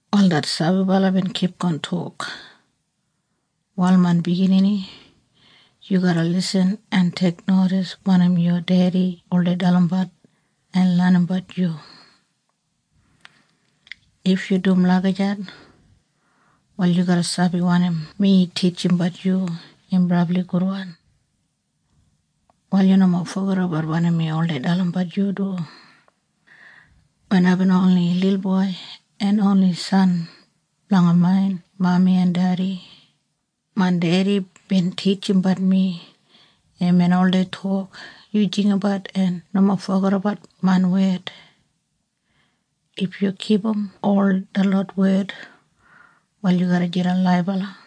Wal det sabibala bin kipgon tok, “Wal main biginini, yu garra lisin en teiknodis wanim yu dedi oldei dalimbat en lenimbat yu. If yu dum lagijat, wal yu garra sabi wanim mi titjimbat yu im brabli gudwan. “Wal yu nomo fogedabat wanim mi oldei dalimbat yu du. Wen aibin oni lilboi en oni san blanga main mami en dedi, main dedi bin titjimbat mi. Imbin oldei tok, ‘Yu jinggabat en nomo fogedabat main wed. If yu kipum ol detlot wed wal yu garra jidan laibala.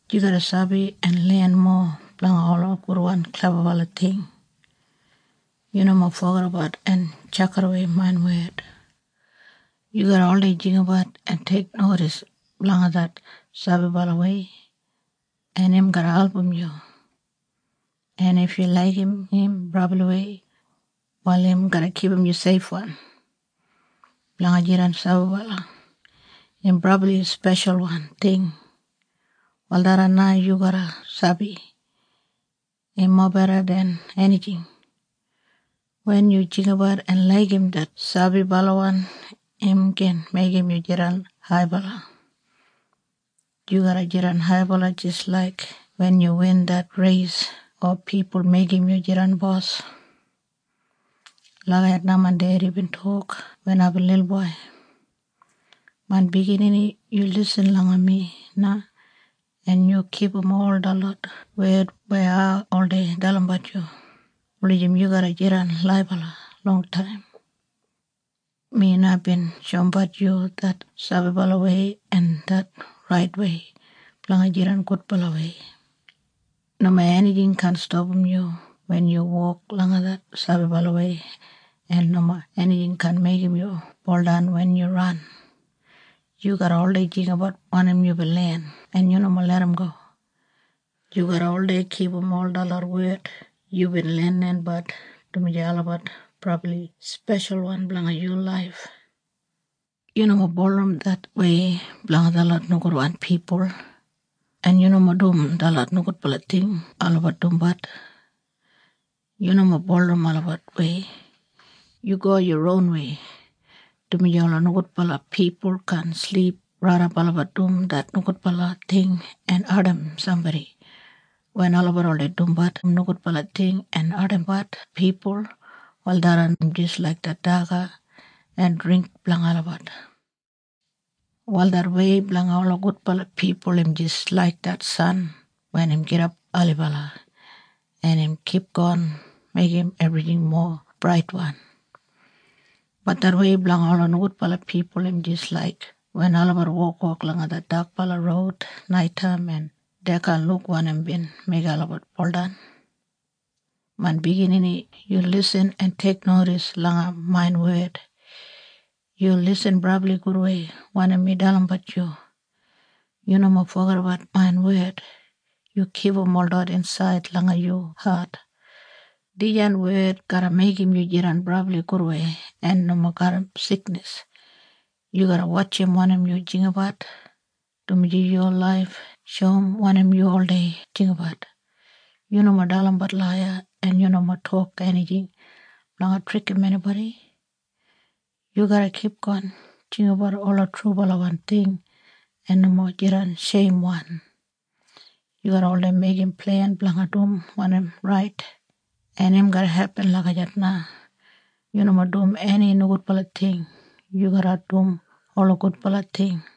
Yu garra sabi en len mowa blanga ola gudwan klebabala ting. Yu nomo fogedabat en tjakidawei main wed. Yu garra oldei jinggabat en teiknodis blanga det sabibalawei en im garra album yu. En if yu laigim im brabliwei, wal im garra kipum yu seifwan. Blanga jidan sabibala im brabli speshalwan ting. Wal tharran na yu garra sabi. Im mobeda den enijing. Wen yu jinggabat en laigim det sabibalawan im gin meigim yu jidan haibala. Yu garra jidan haibala jis laik wen yu win det reis o pipul meigim yu jidan bos.’ Lagijat na main dedi bin tok wen aibin lilboi. “Main biginini, yu lisin langa mi na en yu kipum ol detlot wed weya ai oldei dalimbat yu, wulijim yu garra jidan laibala longtaim. Mi na bin shoumbat yu det sabibalawei en det raitwei blanga jidan gudbalawei. Nomo enijing kaan stapam yu wen yu wok langa det sabibalawei, en nomo enijing kaan meigim yu buldan wen yu ran. Yu garra oldei jinggabat wanim yubin len en yu nomo larramgo. Yu garra oldei kipum ol detlot wed yubin lenlenbat, dumaji olabat brabli speshalwan blanga yu laif. Yu nomo bulurrum det wei blanga detlot nogudwan pipul, en yu nomo dum detlot nogudbala ting olabat dumbat. Yu nomo bulurrum olabat wei. Yu go yu ronwei, dumaji ola nogudbala pipul kaan silip raidap olabat dum det nogudbala ting en ardim sambodi. Wen olabat oldei dumbat nogudbala ting en ardimbat pipul, wal tharran im jis laik det daga en dringk blanga olabat. “Wal det wei blanga ola gudbala pipul im jis laik det san wen im gidap ailibala en im kipgon meigim ebrijing mowa braitwan. Bat det wei blanga ola nogudbala pipul im jis laik wen olabat wokwok langa det dakbala roud naitaim en dei kaan luk wanim bin meigim olabat buldan. “Main biginini, yu lisin en teiknodis langa main wed. Yu lisin brabli gudwei wanim mi dalimbat yu. Yu nomo fogedabat main wed. Yu kipum holot insaid langa yu hat. Dijan wed garra meigim yu jidan brabli gudwei en nomo garram siknis. Yu garra wotjim wanim yu jinggabat, dumaji yu laif shoum wanim yu oldei jinggabat. Yu nomo dalimbat laiya en yu nomo tok enijing blanga trikim enibodi. Yu garra kipgon jinggabat ola trubalawan ting en nomo jidan sheimwan. Yu garra oldei meigim plen blanga dum wanim rait, en im garra hepin lagijat na. Yu nomo dum eni nogudbala ting. Yu garra dum ola gudbala ting.”